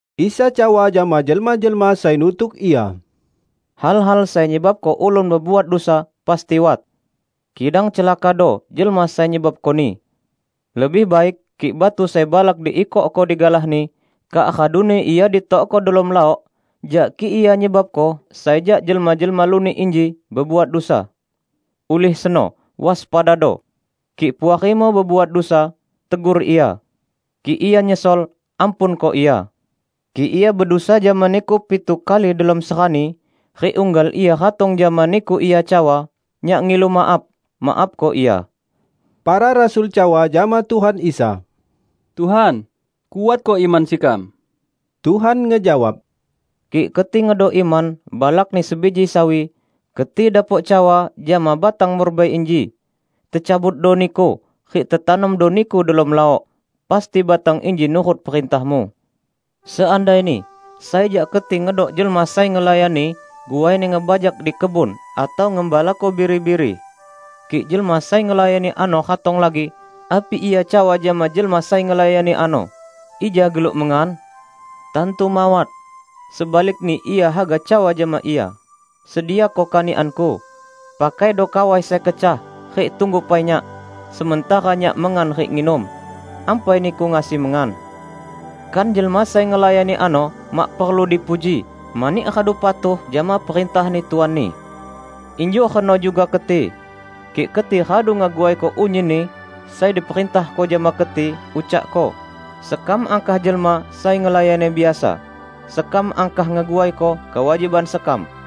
Isa cawa jama jelma-jelma sai nutuk Ia, "Hal-hal sai nyebabko ulun bebuat dusa pasti wat. Kidang celakado jelma sai nyebabkoni! Lebih baik kik batu sai balak diikokko digalahni, kak raduni ia ditokko delom laok jak kik ia nyebabko sai jak jelma-jelma lunik inji bebuat dusa. Ulih seno, waspadado! Kik puarimu bebuat dusa, tegur ia. Kik ia nyesol, ampunko ia. Kik ia bedusa jama niku pitu kali delom serani rik unggal ia ratong jama niku ia cawa, 'Nyak ngilu maaf,' maafko ia." Para rasul cawa jama Tuhan Isa, "Tuhan, kuatko iman sekam." Tuhan ngejawab, "Kik keti ngedok iman balakni sebiji sawi, keti dapok cawa jama batang murbei inji, 'Tecabutdo niku rik tetanomdo niku delom laok,' pasti batang inji nurut perintahmu." "Seandaini sai jak keti ngedok jelma sai ngelayani guaini ngebajak di kebun atau ngembalako biri-biri. Kik jelma sai ngelayani ano ratong lagi, api ia cawa jama jelma sai ngelayani ano, 'Ija geluk mengan'? Tantu mawat! Sebalikni ia haga cawa jama ia, 'Sediako kanikanku. Pakaido kawai sai kecah rik tunggu pai nyak sementara nyak mengan rik nginum; ampai niku ngasi mengan.' Kan jelma sai ngelayani ano mak perlu dipuji mani radu patuh jama perintahni tuanni. Injuk reno juga keti. Kik keti radu ngeguaiko unyinni sai diperintahko jama keti, ucakko, 'Sekam angkah jelma sai ngelayani biasa; sekam angkah ngeguaiko kewajiban sekam.' "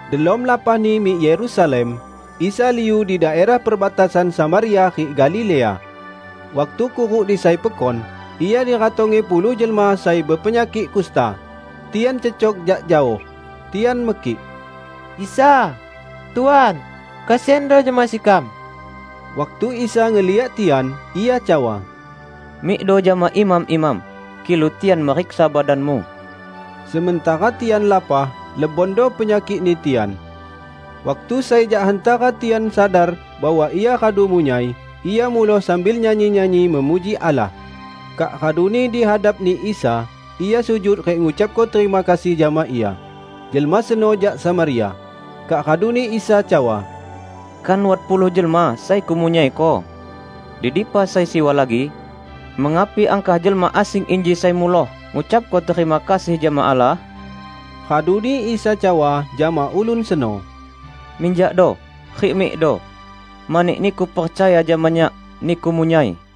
Delom lapahni mik Yerusalem, Isa liu di daerah perbatasan Samaria rik Galilea. Waktu kuruk di sai pekon, Ia diratongi puluh jelma sai bepenyakik kusta. Tian cecok jak jaoh tian mekik, "Isa! Tuan! Kesiando jama sekam!" Waktu Isa ngeliak tian, Ia cawa, "Mikdo jama imam-imam, kilu tian meriksa badanmu." Sementara tian lapah, lebondo penyakikni tian. Waktu sai jak hantara tian sadar bahwa ia radu munyai, ia muloh sambil nyanyi-nyanyi memuji Allah. Kak raduni dihadapni Isa, ia sujud rik ngucapko terima kasih jama Ia. Jelma seno jak Samaria. Kak raduni Isa cawa, "Kan wat puluh jelma sai Kumunyaiko? Di dipa sai siwa lagi? Mengapi angkah jelma asing inji sai muloh ngucapko terima kasih jama Allah?" Raduni Isa cawa jama ulun seno, "Minjakdo, rik mikdo. Mani niku percaya jama Nyak, niku munyai."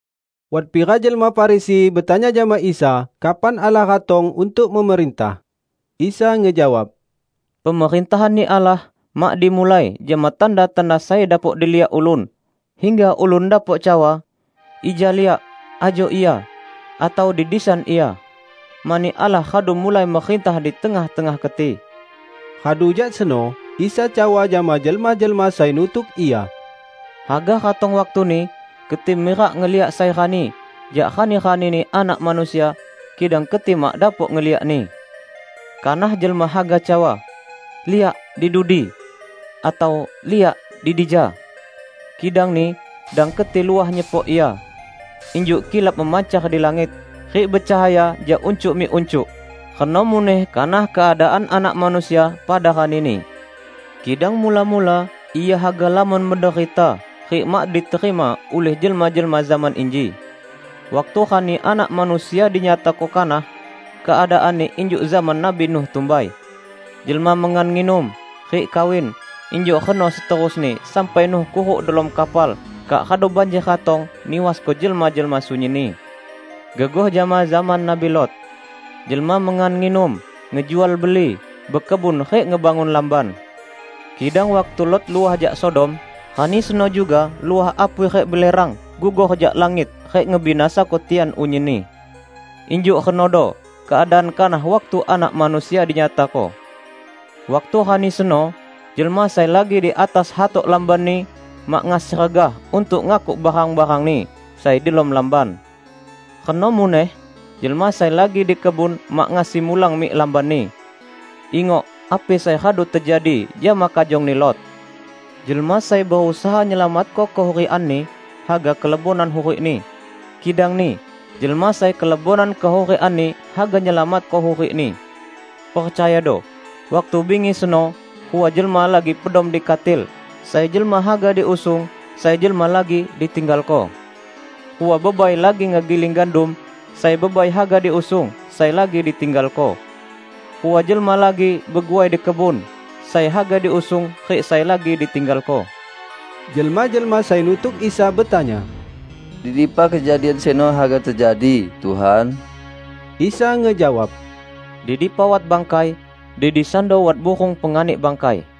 Wat pira jelma Farisi betanya jama Isa kapan Allah ratong untuk memerintah. Isa ngejawab, "Pemerintahanni Allah mak dimulai jama tanda-tanda sai dapok diliak ulun, hingga ulun dapok cawa, 'Ija liak, ajo ia!' atau, 'Di disan ia!' Mani Allah radu mulai merintah di tengah-tengah keti." Radu jak seno Isa cawa jama jelma-jelma sai nutuk Ia, "Haga ratong waktuni keti mirak ngeliak sai rani jak rani-ranini Anak Manusia, kidang keti mak dapok ngeliakni. Kanah jelma haga cawa, 'Liak, di dudi!' atau, 'Liak, di dija!' Kidangni dang keti luah nyepok ia. Injuk kilap memancar di langit, rik becahaya jak uncuk mik uncuk, reno muneh kanah keadaan Anak Manusia pada rani-Ni. Kidang mula-mula Ia haga lamon menderita rik mak diterima ulih jelma-jelma zaman inji. Waktu rani Anak Manusia dinyatako kanah, keadaanni injuk zaman Nabi Nuh tumbai. Jelma mengan nginum, rik kawin; injuk reno seterusni sampai Nuh kuruk delom kapal kak radu banjer ratong niwasko jelma-jelma sunyinni. Gegoh jama zaman Nabi Lot. Jelma mengan nginum, ngejual beli, bekebun rik ngebangun lamban. Kidang waktu Lot luah jak Sodom, rani seno juga luah apui rik belerang gugur jak langit rik ngebinasako tian unyinni. Injuk renodo keadaan kanah waktu Anak Manusia dinyatako. Waktu rani seno jelma sai lagi di atas hatok lambanni mak ngasi regah untuk ngakuk barang-barangni sai delom lamban. Reno muneh jelma sai lagi di kebun mak ngasi mulang mik lambanni. Ingok api sai radu tejadi jama kajongni Lot! Jelma sai berusaha nyelamatko kehurikanni, haga kelebonan hurikni. Kidangni jelma sai kelebonan kehurikanni haga nyelamatko hurikni. Percayado: Waktu bingi seno, rua jelma lagi pedom di katil, sai jelma haga diusung sai jelma lagi ditinggalko. Rua bebai lagi ngegiling gandum, sai bebai haga diusung sai lagi ditinggalko. [ Rua jelma lagi beguai di kebun, sai haga diusung rik sai lagi ditinggalko.]" Jelma-jelma sai nutuk Isa betanya, "Di dipa kejadian seno haga tejadi, Tuhan?" Isa ngejawab, "Di dipa wat bangkai, di disando wat burung penganik bangkai."